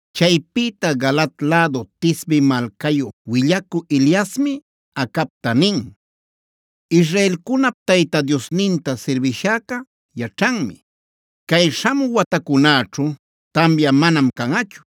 Chaypïta Galaad lädu Tisbe malcayu willacü Eliasmi Acabta nin: “Israelcunap Tayta Diosninta sirbishäca yaćhanmi: Cay śhamü watacunäćhu tamya manam canꞌachu.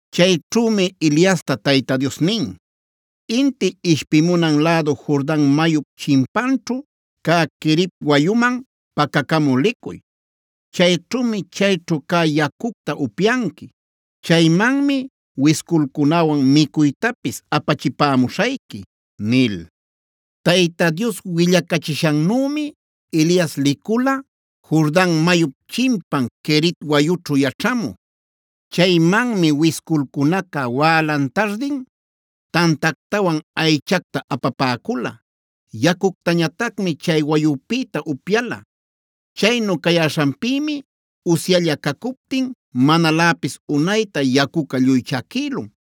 Chayćhümi Eliasta Tayta Dios nin: “Inti ishpimunan lädu Jordan mayup chimpanćhu cä Querit wayuman pacacamü licuy. Chayćhümi chayćhu cä yacucta upyanqui. Chaymanmi wisculcunäwan micuytapis apachipamuśhayqui” nil. Tayta Dios willacachishannümi Elias licula Jordan mayup chimpan Querit wayućhu yaćhamü. Chaymanmi wisculcunaca wälan-tardin tantactawan aychacta apapäcula. Yacuctañatacmi chay wayupïta upyala. Chaynu cayäśhanpïmi usyalla cacuptin manaläpis unayta yacuca lluy chaquïlun.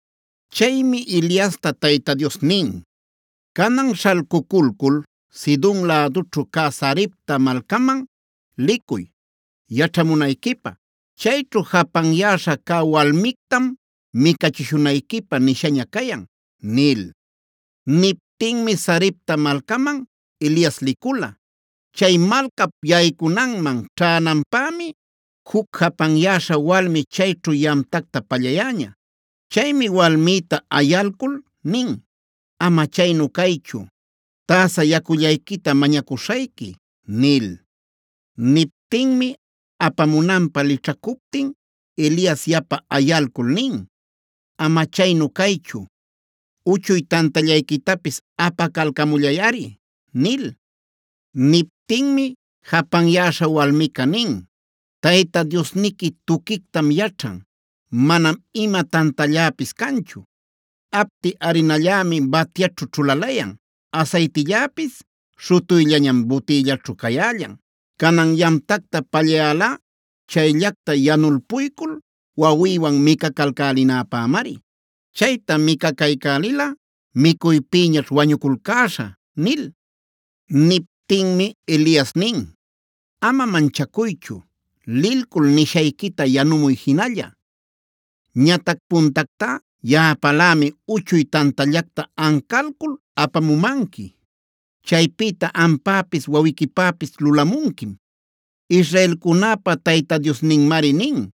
Chaymi Eliasta Tayta Dios nin: “Canan śhalcuculcul Sidon lädućhu cä Sarepta malcaman licuy yaćhamunayquipä. Chayćhu japanyäśha cä walmictamb micachishunayquipä nishaña cayan” nil. Niptinmi Sarepta malcaman Elias licula. Chay malcap yaycunanman ćhänampämi juc japanyäśha walmi chayćhu yamtacta pallayäña. Chaymi walmïta ayalcul nin: “Ama chaynu caychu, täsa yacullayquita mañacuśhayqui” nil. Niptinmi apamunanpä lićhacuptin Elias yapa ayalcul nin: “Ama chaynu caychu, uchuy tantallayquitapis apacalcamullayꞌari” nil. Niptinmi japanyäśha walmica nin: “Tayta Diosniqui tuquictam yaćhan; manam ima tantalläpis canchu. Apti arinallämi batyaćhu ćhulalayan, asaytilläpis śhutuyllañam butïllaćhu cayällan. Canan yamtacta pallayälá chayllacta yanulpuyculc wawïwan micalcälinapämari. Chayta micacaycälilꞌa micuypïñaćh wañuculcäśhä” nil. Niptinmi Elias nin: “Ama manchacuychu. Lilcul nishayquita yanumuy jinalla. Ñatac puntactá yaꞌapälämi uchuy tantallacta ancalcul apamumanqui. Chaypïta ampäpis wawiquipäpis lulamunquim. Israelcunäpa Tayta Diosninmari nin: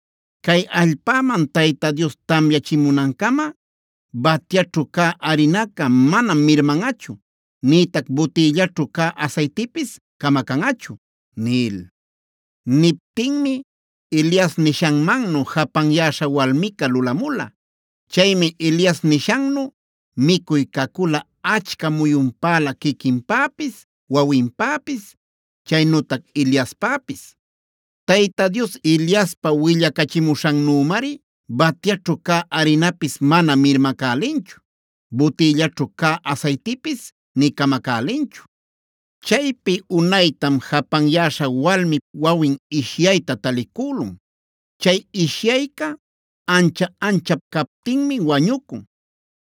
‘Cay allpäman Tayta Dios tamyachimunancama, batyaćhu cä arinaca manam mirmanꞌachu, nïtac butïllaćhu cä asaytipis camacanꞌachu’” nil. Niptinmi Elias nishanmannu japanyäśha walmica lulamula. Chaymi Elias nishannu micuy cacula achca muyunpälä quiquinpäpis, wawinpäpis, chaynütac Eliaspäpis. Tayta Dios Eliaspa willacachimuśhannümari batyaćhu cä arinapis mana mirmacälinchu, butïllaćhu cä asaytipis nï camacälinchu. Chaypi unaytam japanyäśha walmip wawin ishyayta talicülun. Chay ishyayca ancha-anchap captinmi wañucun.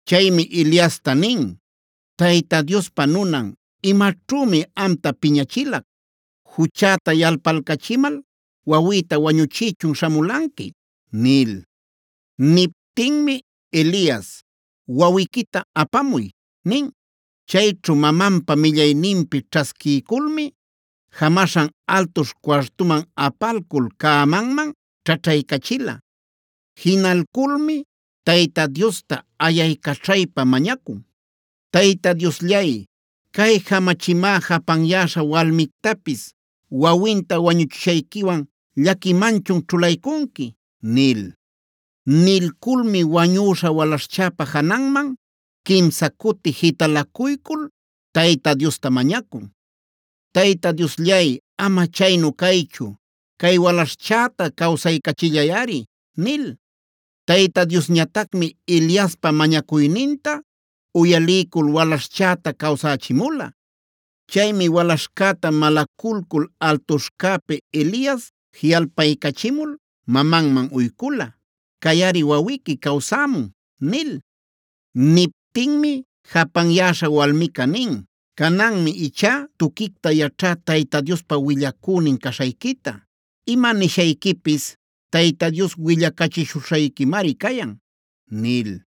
Chaymi Eliasta nin: “Tayta Diospa nunan, ¿imaćhümi amta piñachilac? ¿Juchäta yalpalcachimal wawïta wañuchïchun śhamulanqui?” nil. Niptinmi Elias: “Wawiquita apamuy” nin. Chayćhu mamanpa millayninpi ćhasquiyculmi jamaśhan altuśh cuartuman apalcul cämanman ćhaćhaycachila. Jinalculmi Tayta Diosta ayaycaćhaypa mañacun: “Tayta Diosllay, ¿cay jamachimá japanyäśha walmictapis wawinta wañuchishayquiwan llaquimanchun ćhulaycunqui?” nil. Nilculmi wañüśha walaśhchäpad jananman quimsa cuti jitalacuycul Tayta Diosta mañacun: “Tayta Diosllay, ama chaynu caychu, cay walaśhchäta cawsaycachillayꞌari” nil. Tayta Diosñatacmi Eliaspa mañacuyninta uyaliycul walaśhchäta cawsächimula. Chaymi walaśhcäta malaculcul altuśhcäpi Elias jiꞌalpaycachimul mamanman uycula: “Cayꞌari wawiqui cawsämun” nil. Niptinmi japanyäśha walmica nin: “Cananmi ichá tuquicta yaćhá Tayta Diospa willacünin caśhayquita. Ima nishayquipis Tayta Dios willacachishuśhayquimari cayan” nil.